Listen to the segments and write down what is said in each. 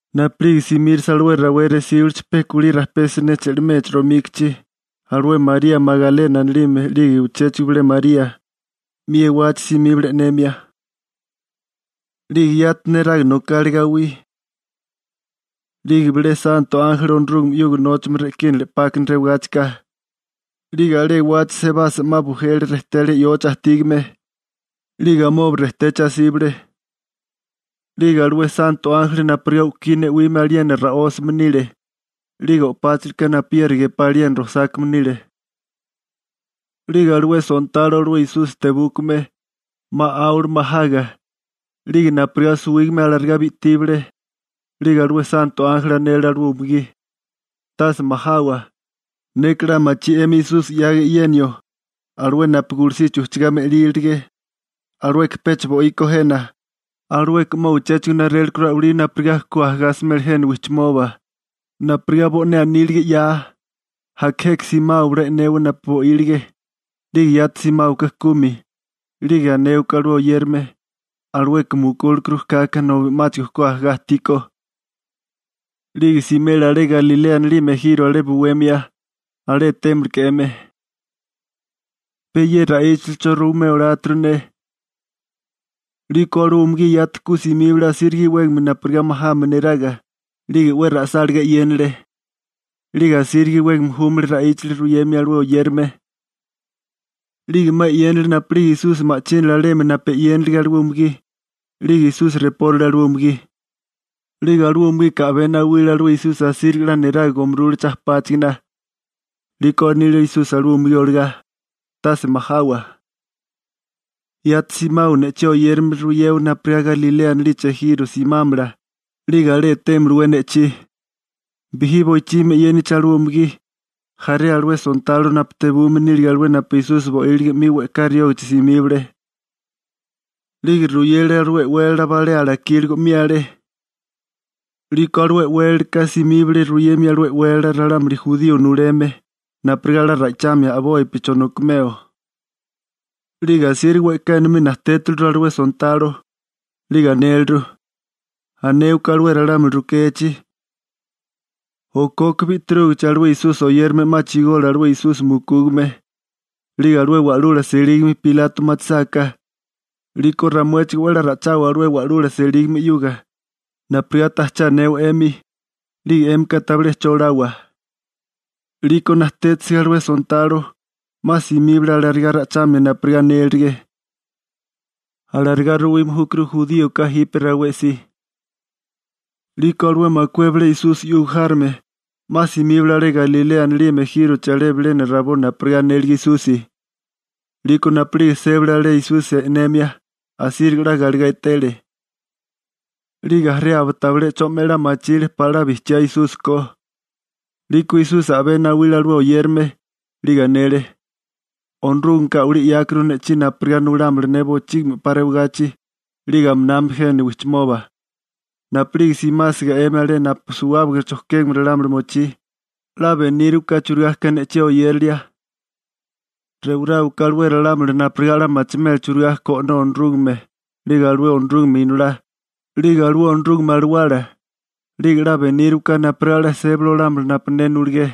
Napu'lige simírasa alué rawé resíbilichi pe kulí rajpé siné che'limechi romíkichi, alué María Magalena anilime 'lige uchéchigo bilé María, 'mi ewachi simíbale e'nemia. 'Lige yati neraga nokale gawí. 'Lige bilé santo ánjeli Onorúgame 'yuga nóchame re'kínale 'pákana rewagáchika, 'lige alé ewachi sebasa 'ma bujele rejté alé yochi ajtígame, 'lige amoba rejtechi asíbale. 'Lige alué santo ánjeli napurigá u'kí ne'wime aliena ra'ósame nile, 'lige o'páchalaka napuyeri gepá aliena rojsákame nile. 'Lige alué sontalo, alué Esusi tebúkame, 'ma 'áwale majaga. 'Lige napurigá suwígame alarigá bi'tíbale. 'Lige alué santo ánjeli anele alué umugí: ―Tase majawa, neka 'la machí 'emi Esusi 'yaga e'yenio, alué napu gulusichi ujchigá me'lílirige. Alueka pecha bo'íkó jena, alueka 'ma uchéchigo narélekuru a'walí napurigá ku ajagá asimela jena wijchimoba, napurigá bo'né anílige 'ya. Aka jeka simáwabala e'newa napu bo'ílige. 'Lige yati simáwaká kumi, 'lige anéwaká alué oyérame: «Alueka mukúlekuru kaka nobi 'máchigo ku ajagá ajtíkó. 'Lige simela alé Galilea anilime ejiro alé buwemia, alé etémaleké 'emi.» Pe ye ra'íchilicho ruimeo oláturu ne. 'Liko alué umugí yati ku simíbale asíriga iwégame napurigá majame neraga, 'lige 'we ra'sálagá e'yénale. 'Lige asíriga iwégame júmale ra'íchali ruyemia alué oyérame. 'Lige 'ma e'yénale napu'lige Esusi ma'chínale alemi napu e'yénilige alué umugí, 'lige Esusi repórale alué umugí. 'Lige alué umugika a'bé nawile alué Esusi asíriga 'la neraga gomurule chajpáchigana. 'Liko anile Esusi alué umugí olagá: ―Tase majawa. Yati simawa ne'chí oyérame ruyewa napurigá Galilea anilichi ejiro simámala, 'lige alé etémalawé ne'chí. Bijí boichimi e'yénigichi alué umugí, jaré alué sontalo napu tebume nílige alé napu Esusi bo'ílige 'mi we'ká riógichi simíbale. 'Lige ruyele alué e'wélala balé alakíligo 'mi alé. 'Liko alué e'wélalaka simíbale ruyemia alué e'wélala ralámuli jurío nuleme, napurigá 'la ra'ichamia a'bopi chonokimeo. 'Lige asíriga we'ká enomí najtétiliru alué sontalo. 'Lige anéleru: ―Anéwaká ralámuli rukechi: «Okoka bi'tirúgichi, alué Esusi oyérame 'ma chigole alué Esusi mukúgame.» 'Lige alué wa'lula selígame Pilato machisáká, 'liko ramuéchigó 'we a'lá ra'íchawa alué wa'lula selígame 'yuga, napurigá tajché anewa 'emi, 'lige 'émika tabilé che olawa. 'Liko natétisiga alué sontalo, 'ma simíbale alarigá ra'ichamia napurigá anélirige. Alarigá ruwime júkuru juríoka jipe rawé si. 'Liko alué makué bilé Esusi 'yuga járome, 'ma simíbale alé Galilea anilime ejírochi alé bilena rabó napurigá anélige Esusi. 'Liko napu'lige sébale alé Esusi e'nemia, asíriga 'la galegá etele. 'Lige jaré aba tabilé 'cho 'me 'la machile pala 'la bijchiá Esusi ko. 'Liko Esusi a'bé nawile alué oyérame, 'lige anele: ―Onorúgameka a'walí 'yákuru ne'chí napurigá nulámala ne bochígimi 'pa rewagachi, 'lige aminami jemi wijchimoba. Napu'lige simásiga 'emi alé napu suwábaga chojkégame ralámuli mochí, 'la benírawaká churigá ka ne'chí oyérilia. Rewaráwaká alué ralámuli napurigá 'la machimela churigá ko O'nó Onorúgame, 'lige alué Onorúgame Inolá, 'lige alué Onorúgame Alawala. 'Lige 'la benírawaká napurigá 'la sébali olámala napu ne nuligé.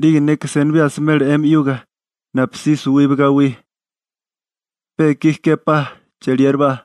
'Lige neka senibí asimela 'emi 'yuga, napusí suwiba gawí. Pe ikí képá ye ra'íchali. Wa'lú cheliérabá.